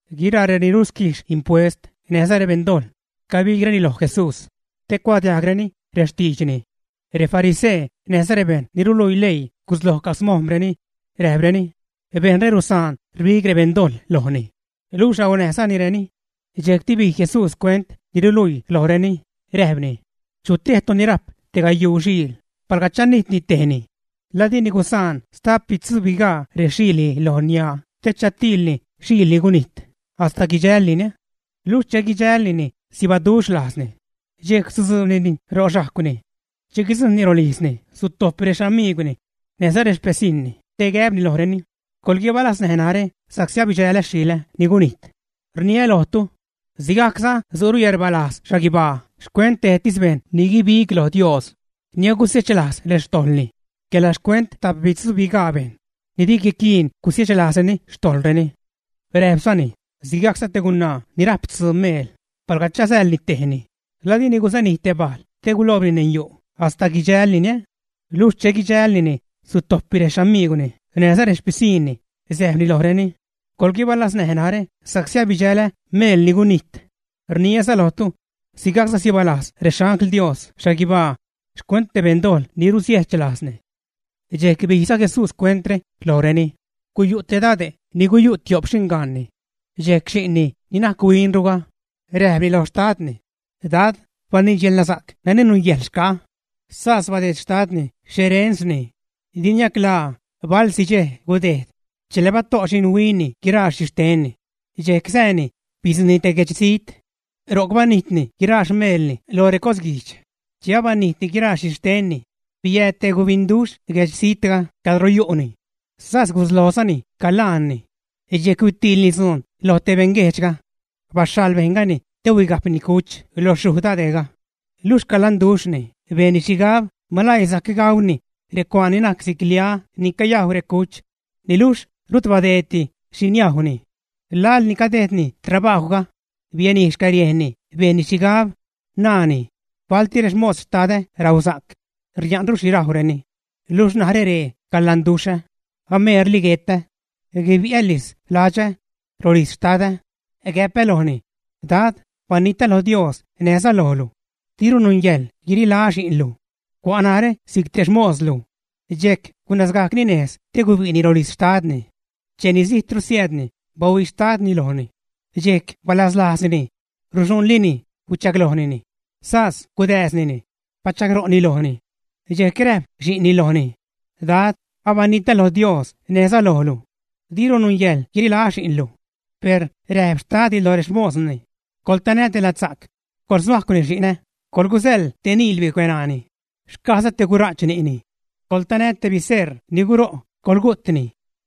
Guiraa reni rusquijx impuest näjza rebeṉdojḻ cabigreni loj Jesús, te cuadiajgreni rextiidxni. Refarisee näjza rebejṉ ni ruluii leii gusloj camojm̲reni, räjpreni: ―Bejṉre rusaan rbig rebeṉdojḻ lojni, luxh raunäjzanireni. Dxejcti bij Jesús cuent ni ruluiire lojreni, räjpni: ―Chutejtu ni rajp tegayuu xiil, palga chanijtni tejni, ¿la dini gusaan stapbitzuubigaa rexiilni lo niaa te chatiilni xile' ni gunijt, hasta guidxällinini, ä? Luxh che guidxälnini sibaduxh lajzni, dxejc sutzuubnini ro xhajcwni. Che guidzujṉni rolijzni sutojpni rexamiigwni näjza rexpisiṉni te gäbni lojreni: “Coḻguibalaznäj narä sa'csi abidxälä xile' ni gunijt.” Rniä lojtu, sigajcza su'ru yäḻrbalajz xhaguibaa xcuent tejtis bejṉ ni guibig lo Dios ni gusiechlajz xtojḻni quela xcuent tapbitzubigaa bejṉ ni di guiquiin gusiechlazreni xtojḻreni. Räjpzani: ―Sigajcza te gunaa ni rajp tzuu meel, palga chasäḻni tejni, ¿la dini gusanij te bajl te guloobni neṉ yu' hasta guidxälnini, ä? Luxh che guidxälnini, sutojpni rexamiigwni näjza rexpisiṉni, säjpni lojreni: “Coḻguibalaznäj narä sa'csi abidxälä meel ni gunijt.” Rniäza lojtu, sigajcza sibalajz rexangl Dios xhaguibaa xcuent te beṉdojḻ ni rusiechlajzni. Dxejc bijza Jesús cuentre lojreni: ―Guyu' te dade' ni yu' tio'p xingaanni. Dxejc xi'nni ni najc huinruga, räjpni lo xtadni: “Dad, baniidx yälnasa'c nani nungäjḻ xca'a.” Sas badeed xtadni xerensni. Di niaclaa, balsi dxej gudejd, chela bato' xinhuinni guiraa xhixtenni, dxejc sääni, bidzujṉni te guedxzijt. Ro'c banijtni guiraa xmeelni lo recosguijdx. Che abanijtni guiraa xhixtenni, biääd te gubinduxh guedxzijtga cadro yu'ni. Sas guslojzani calaanni. Dxejc huitiilni dzuun lo te beṉguejdxga. Baxhaḻ bejṉgani te huigajpni cuch lo xyuj dade'ga. Luxh calanduxhni bejnni xhigab malaii sajc gauni recuaan ni najc si'c lia ni cayajw recuch, niluxh rut badeeddi xhi niajwni. Laḻ ni cadejdni trabajwga, bianij xcäriejnni bejnni xhigab, naani: “Balti rexmos xtadä rausa'c, ria'nru xhi gaureni. Luxh narä ree calanduxhä, ameerli guetä. Guibi'älis ladxä, rolijz xtadä, gäpä lojni, Dad, banitä lo Dios näjza lojlu. Diru nungäjḻ guirilaä xi'nlu. Cua' narä si'c te xmoslu.” Dxejc gunazgajcni nejz te gubi'ni rolijz xtadni. ’Cheni zijtru siäädni, bahuii xtadni lojni. Dxejc balaslajznini, ruxuṉlini, huichaglojnini, sas gudääznini, bachagro'ni lojni. Dxejc räjp xi'nni lojni: “Dad, abanitä lo Dios näjza lojlu. Diru nungäjḻ guirilaä xi'nlu.” Per räjp xtadni loj rexmosni: “Coḻtanä te ladsa'c, coḻshuajcwnini xi'nä, coḻgusäḻ te niil bicueṉaani, xcajza te gura'ch ni'ni. Coḻtanä te biseṟ ni guro' coḻgu'tni.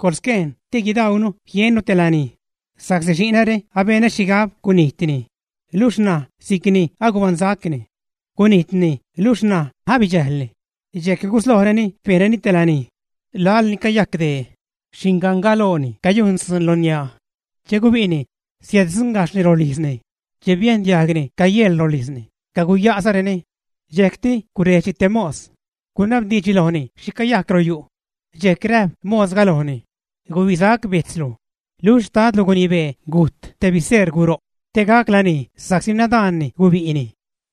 ¡Coḻsquejn te guidauunu, jiennu te lanij! Sa'csi xi'näre abenä xhigab gujtni, luxh ṉaj si'cni agubaṉsacni, gunijtni niluxh ṉaj abidxäjlni.” Dxejc guslojreni bejnreni te lanij. ’Laḻ ni cayajc dee, xingangalooni cayujn dzuun lo niaa. Che gubi'ni, siäddzuṉgajxhni rolijzni, che biejn diajgni cayeḻ rolijzni, caguya'zareni. Dxejcti gurejdxni te mos, gunabdiidxni lojni xhi cayajc royu'. Dxejc räjp mosga lojni: “Gubisac bejtzlu, luxh xtadlu gunibee gujt te biseṟ guro' te gac lanij sa'csi nadaanni gubi'ni.”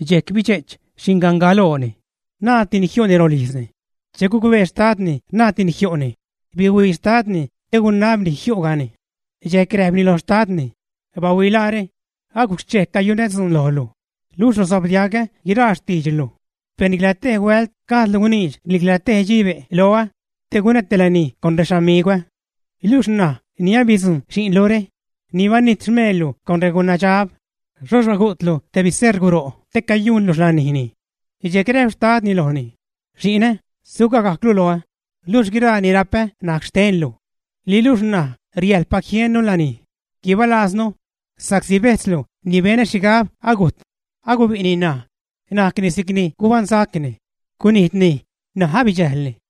Dxejc bidxe'ch xingangalooni. Naadtini jiu'ni rolijzni. Che gucbee xtadni naadtini jiu'ni, bihuii xtadnini te gunabni jiu'gani. Dxejc räjpni lo xtadni: “¡Bahuilaare! Agujc xchej cayunä dzuun lojlu, luxh rusobdiagä guiraa xtiidxlu, per nicla tej huält gajdlu guniidx nicla te dxibe' loä te gunä te lanij con rexamigwä. Luxh ṉaj ni abidzujṉ xi'nlure, ni banijt xmeellu con regunadxab, xhoxh bagu'tlu te biseṟ guro' te cayujnlu xlanijni.” Dxejc räjp xtadni lojni: “Xi'nä, sugagajclu loä, luxh guiraa ni rapä najc xtenlu. Niluxh ṉaj riäjḻpac jiennu lanij, guibalaaznu, sa'csi bejtzlu ni benä xhigab agujt, agubi'ni ṉaj, najcni si'cni gubaṉsacni; gunijtni, ṉaj abidxäjlni.”